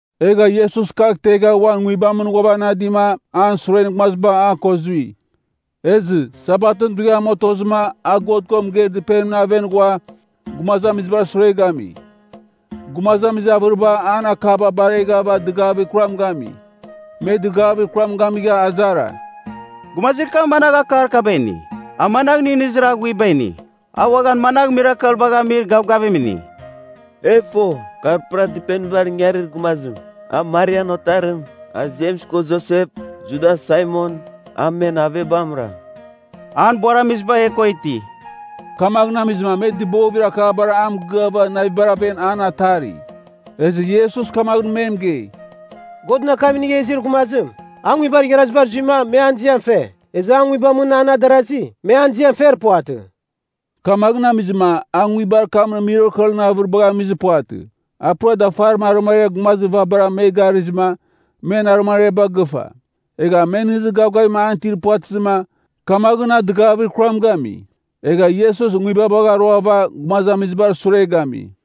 Egha Iesus kagh tegha uan nguibamɨn ghuavanadima an suren gumaziba a ko zui. Ezɨ, Sabatɨn dughiam otozɨma a God ko mɨgeir dɨpenimɨn aven ghua, gumazamizibar sure gami. Gumazamizir avɨriba an akaba bareghava dɨgavir kuram gami. Me dɨgavir kuram gamigha azara, “Gumazir kam managh akar kaba ini? A managh nɨghnɨzir aghuiba ini? A uaghan managh mirakelbagh amir gavgavim ini? E fo, kar pura dɨpenibar ingarir gumazim. A Marian otarim, a Jems ko Josep, Judas, Saimon, a men avebamra. An buaramiziba e ko iti.” Kamaghɨn amizɨma me dɨbovir akabar a mɨgɨava navibar aven an atari. Ezɨ Iesus kamaghɨn me mɨgei, “Godɨn akam inigha izir gumazim, a nguibar igharazibar zuima, me an ziam fe. Ezɨ an nguibamɨn an adarasi, me an ziam fer puvatɨ.” Kamaghɨn amizɨma a nguibar kamɨn mirakelɨn avɨribagh amizir puvatɨ. A pura dafarim arɨmariar gumazir vabara me garɨghizɨma, men arɨmariaba gɨfa. Egha me nɨghnɨzir gavgavim an itir puvatɨzɨma, kamaghɨn a dɨgavir kuram gami. Egha Iesus nguibabagh aruava gumazamizibar sure gami.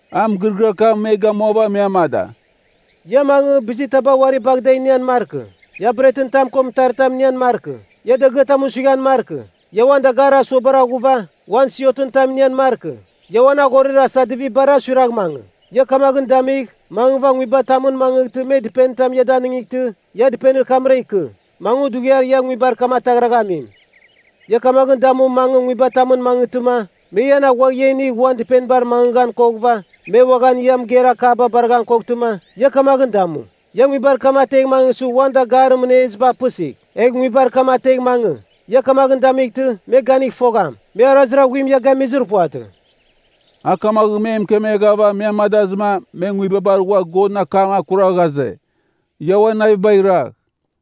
A mɨgɨrɨgɨar kam me gamuava me amada, “Ia mangɨ, bizir taba uari bagh da inian markɨ. Ia bretɨn tam ko mɨtaritam inian markɨ. Ia dagɨatam suighan markɨ. Ia uan dagarir asuaba aghuva, ua siotɨn tam inian markɨ. Ia uan aghorir asadivibara suiragh mangɨ. Ia kamaghɨn damigh, mangɨva nguibatamɨn mangɨghtɨ me dɨpenitam ia danightɨ, ia dɨpenir kamra ikɨ, mangɨ dughiar ia nguibar kam ataghraghamim. Ia kamaghɨn damu mangɨ nguibatamɨn mangɨghtɨma, me ian aghuagh ia inigh uan dɨpenibar mangɨghan koghɨva, me uaghan ia mɨgeir akaba baraghan koghtɨma, ia kamaghɨn damu. Ia nguibar kam ategh mangɨsɨ uan dagarir mɨneziba apɨsigh, egh nguibar kam ategh mangɨ. Ia kamaghɨn damightɨ, me ganigh fogham, me arazir aghuim ia gamizir puvatɨ.” A kamaghɨn me mɨkemeghava me amadazɨma me nguibabar ghua Godɨn akam akura ghaze, Ia uan navibagh iragh.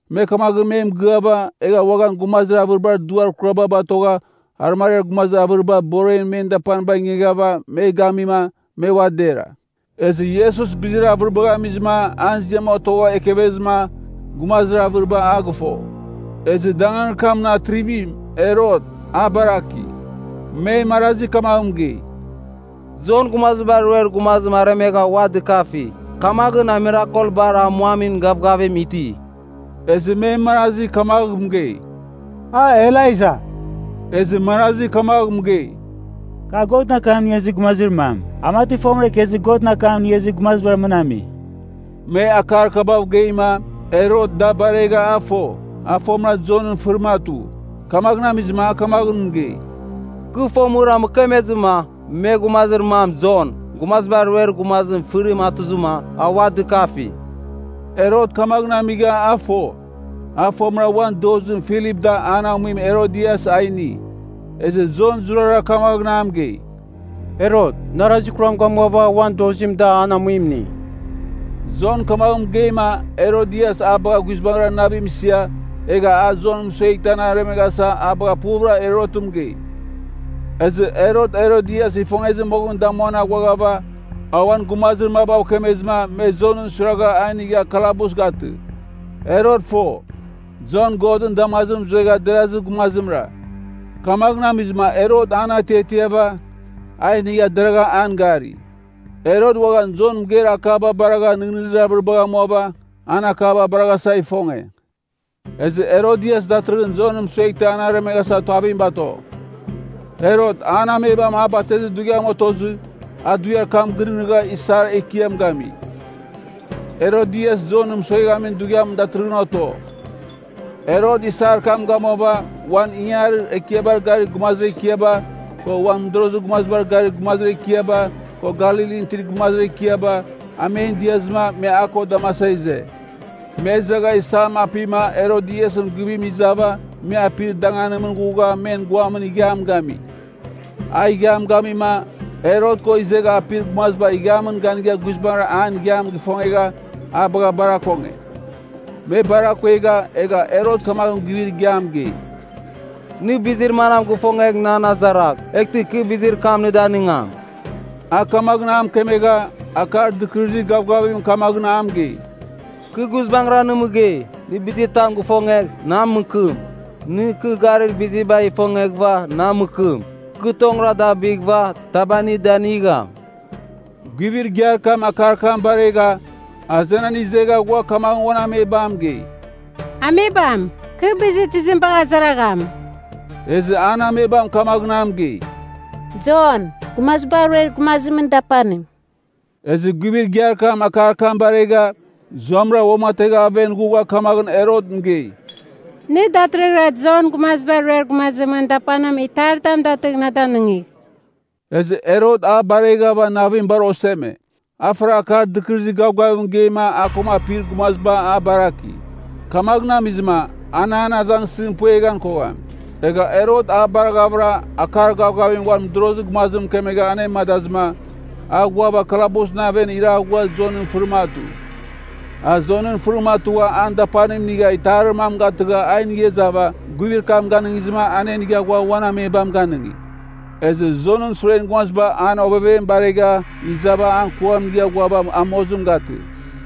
Me kamaghɨn me mɨgɨava, egha uaghan gumazir avɨribar duar kuraba batogha arɨmariar gumazir avɨriba boremɨn men dapaniba ingiava me gamima, me ua dera. Ezɨ Iesus bizir avɨribagh amizɨma an ziam otogha ekevezɨma, gumazir avɨriba a gɨfo. Ezɨ danganir kamɨn atrivim, Herot, a baraki. Me marazi kamagh mɨgei, “Jon Gumaziba Ruer Gumazim aremegha ua dɨkafi. Kamaghɨn a mirakelbar amuamin gavgavim iti.” Ezɨ me marazi kamagh mɨgei, “A Elaija.” Ezɨ marazi kamagh mɨgei, “Kar Godɨn akam inigha izir gumazir mam, a mati fomɨra ikezir Godɨn akam inigha izir gumazibar mɨn ami.” Me akar kabav geima, Herot da baregha a fo, a fomɨra Jonɨn fɨrim atu. Kamaghɨn amizɨma a kamaghɨn mɨgei, “Kɨ fomɨra mɨkemezɨma, me gumazir mam Jon, Gumazibar Ruer Gumazimɨn fɨrim atuzɨma, a ua dɨkafi.” Herot kamaghɨn amigha a fo, a fomɨra uan dozim Filip da an amuim Herodias a ini. Ezɨ Jon zurara kamaghɨn a mɨgei, “Herot, na arazir kuram gamuava uan dozim da an amuim ini.” Jon kamagh mɨgeima, Herodias a bagha guizbangɨra navim isia, egha a Jon mɨsueghtɨ an aremeghasa a bagha puvɨra Herotɨn mɨgei. Ezɨ Herot Herodias ifongezir moghɨn damuan aghuaghava, a uan gumazir mabav kemezɨma me Jonɨn suiragha a inigha kalabus gatɨ. Herot fo, Jon Godɨn damazimɨn zuegha derazir gumazimra. Kamaghɨn amizɨma Herot an atiatiava, a inigha deragha an gari. Herot uaghan Jon mɨgeir akaba baragha nɨghnɨzir avɨribagh amuava, ana akaba baraghasa ifonge. Ezɨ Herodias datɨrɨghɨn Jon mɨsueghtɨ an aremeghasa tuavim bato. Herot an amebam a batezir dughiam otozɨ, a dughiar kam gɨnɨghnɨgha isar ekiam gami. Herodias Jonɨn mɨsoghamin dughiam datɨrɨghɨn oto. Herot isar kam gamuava, uan ingangarir ekiabar gari gumazir ekiaba, ko uan mɨdorozir gumazibar gari gumazir ekiaba, ko Galilin itir gumazir ekiaba, a men diazɨma me a ko damasa ize. Me izegha isam apima Herodiasɨn guivim izava me apir danganimɨn ghugha men guamɨn ighiam gami. A ighiam gamima, Herot ko izegha apir gumaziba ighiamɨn ganigha guizbangɨra an ighiam gifongegha a bagha bar akonge. Me bar akuegha, egha Herot kamaghɨn guivir igiam mɨgei, “Nɨ bizir manam gifongegh nan azaragh. Eghtɨ kɨ bizir kam nɨ danigam.” A kamaghɨn a mɨkemegha, akar dɨkɨrɨzir gavgavim kamaghɨn a mɨgei, “Kɨ guizbangɨra nɨ mɨgei, nɨ bizitam gifongegh, na mɨkɨm. Nɨ kɨ garir bizibagh ifongeghɨva, na mɨkɨm. Kɨ tongɨra da bighɨva, taba nɨ danigham.” Guivir igiar kam akar kam baregha, azenan izegha ghua kamaghɨn uan amebam mɨgei, “Amebam, kɨ bizir tizim bagh azaragham?” Ezɨ an amebam kamaghɨn a mɨgei, “Jon, Gumaziba Ruer Gumazimɨn, dapanim.” Ezɨ guivir kam akar kam baregha, zuamɨra uamategha aven ghugha kamaghɨn Herot mɨgei, “Nɨ datɨrɨghɨra Jon, Gumaziba Ruer Gumazimɨn, dapanim itaritam datɨgh na danɨngigh.” Ezɨ Herot a bareghava navim bar oseme. A faragha akar dɨkɨrɨzir gavgavim mɨgeima a ko apir gumaziba a baraki. Kamaghɨn amizɨma, an an azangsɨzim pueghan kogham. Egha Herot a baraghavɨra, akar gavgavim uan mɨdorozir gumazim mɨkemegha anemadazɨma a ghuava kalabusɨn aven iraghugha Jonɨn fɨrim atu. A Jonɨn fɨrim atugha an dapanim inigha itarir mam gatɨgha a inigha izava guivir kam ganɨngizɨma anenigha ghua uan amebam ganɨngi. Ezɨ Jonɨn suren gumaziba an ovevem baregha izava an kuam inigha ghuava a mozim gatɨ.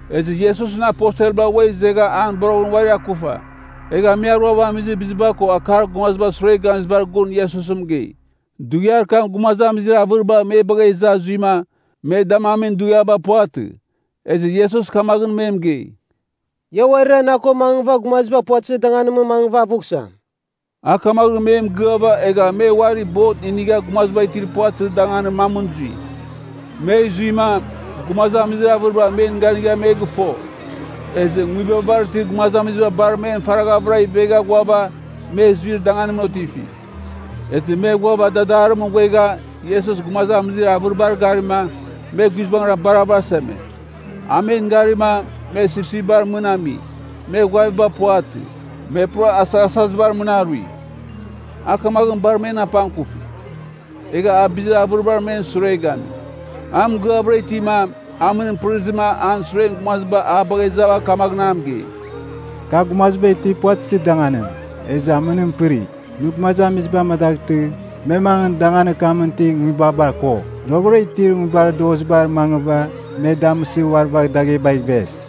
Ezɨ Iesusɨn aposelba ua izegha an boroghɨn uari akufa. Egha me aruava amizir biziba ko akar gumazibar sure gamizibar gun Iesus mɨgei. Dughiar kam gumazamizir avɨriba me bagha iza zuima, me damamin dughiaba puvatɨ. Ezɨ Iesus kamaghɨn me mɨgei, “Ia uarira na ko mangɨva gumaziba puvatɨzir danganimɨn mangɨva avughsam.” A kamaghɨn me mɨgɨava egha me uarira bot inigha gumaziba itir puvatɨzir danganir mamɨn zui. Me zuima, gumazamizir avɨriba men ganigha me gɨfo. Ezɨ nguibabar itir gumazamiziba bar men faraghavɨra ivegha ghuava me zuir danganimɨn otifi. Ezɨ me ghuava dadarimɨn ghuegha Iesus gumazamizir avɨribar garima, me guizbangɨra bar avɨraseme. A men garima, me sipsipbar mɨn ami, me ghuaviba puvatɨ, me pura asaghasazibar mɨn arui. A kamaghɨn bar men apangkufi. Egha a bizir avɨriba men sure gami. A mɨgɨavɨra itima, amɨnim pɨrizɨma an suren gumaziba a bagha izava kamaghɨn a mɨgei, “Kar gumaziba itir puvatɨzir danganim, ezɨ amɨnim pɨri. Nɨ gumazamiziba amadaghtɨ, me mangɨ danganir kamɨn itir nguibaba ko roghɨra itir nguibar dozibar mangɨva me damɨsɨ uari bagh daghebagh ives.”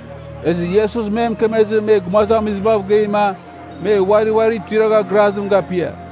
Ezɨ Iesus me mɨkemezɨ me gumazamizibav geima, me uari uari tuiragha grazim gapia.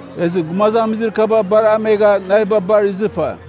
Ezɨ gumazamizir kaba bar amegha, naviba bar izɨfa.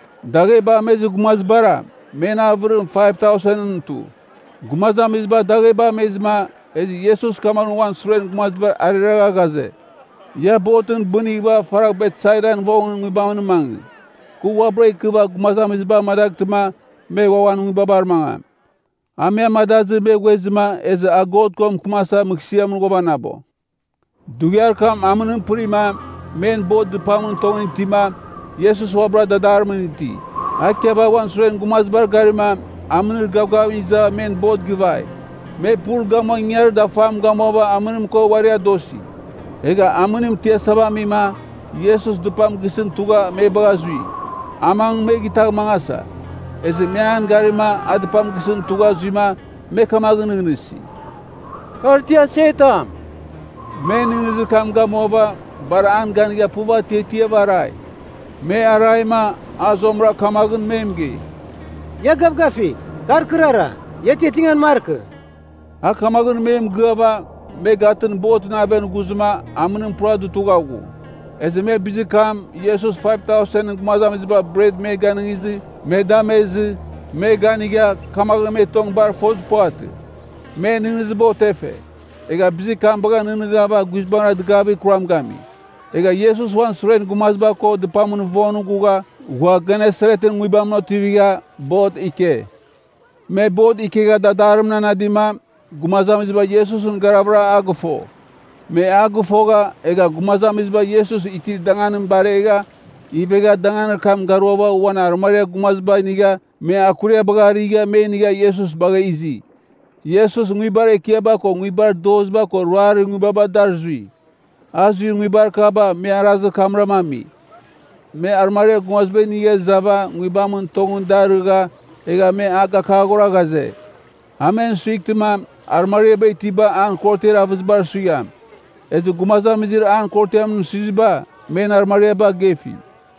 Dagheba amezir gumazibara, men avɨrim 5,000ɨn tu. Gumazamiziba dagheba amezɨma, ezɨ Iesus kamaghɨn uan suren gumazibar ariragha ghaze, Ia botɨn bɨnighɨva faragh Betsaidan vongɨn nguibamɨn mangɨ. Kɨ uabɨra ikɨva gumazamiziba amadaghtɨma me ua uan nguibabar mangam. A me amadazɨ, me ghuezɨma, ezɨ a God ko mɨkɨmasa mɨghsɨamɨn ghuavanabo. Dughiar kam amɨnim pɨrima, men bot dɨpamɨn tongɨn itima, Iesus uabɨra dadarimɨn iti. A ikiava uan suren gumazibar garima, amɨnir gavgavim izava men bot gɨvai. Me pul gamua ingangarir dafam gamuava amɨnim ko uari adosi. Egha amɨnim tiasava amima, Iesus dɨpam gisɨn tugha me bagha zui. A mangɨ me gitagh mangasa. Ezɨ me an garima, a dɨpam gisɨn tugha zuima, me kamaghɨn nɨghnɨsi, “Kar ti asetam.” Me nɨghnɨzir kam gamuava, bar an ganigha puv atiatiava arai. Me araima, a zuamɨra kamaghɨn me mɨgei, “Ia gavgafigh, kar kɨrara. Ia atiatingan markɨ!” A kamaghɨn me mɨgɨava, me gatɨn botɨn aven ghuzɨma, amɨnim pura dutugha ghu. Ezɨ me bizir kam, Iesus 5,000ɨn gumaziba bretba me ganɨngizɨ, me damezɨ, me ganigha, kamaghɨn me tong bar fozir puvatɨ. Men nɨghnɨziba otefe. Egha bizir kabagh nɨghnɨghava guizbangɨra dɨgavir kuram gami. Egha Iesus uan suren gumaziba ko dɨpamɨn vongɨn ghugha, ghua Genesaretɨn nguibamɨn otivigha, bot ike. Me bot ikegha dadarimɨn anadima, gumazamiziba Iesusɨn garavɨra a gɨfo. Me a gɨfogha, egha gumazamiziba Iesus itir danganim baregha, ivegha danganir kam garuava uan arɨmariar gumaziba inigha me akuriabagh arigha me inigha Iesus bagha izi. Iesus nguibar ekiaba ko nguibar doziba ko ruarir nguibaba dar zui. A zuir nguibar kaba me arazir kamram ami, me arɨmariar gumaziba inigha izava nguibamɨn tongɨn da arɨgha, egha me a gakaghora ghaze, a men asughtɨma, arɨmariaba itiba an korotiar avɨzibar suigham. Ezɨ gumazamizir an korotiamɨn suiziba, men arɨmariaba gefi.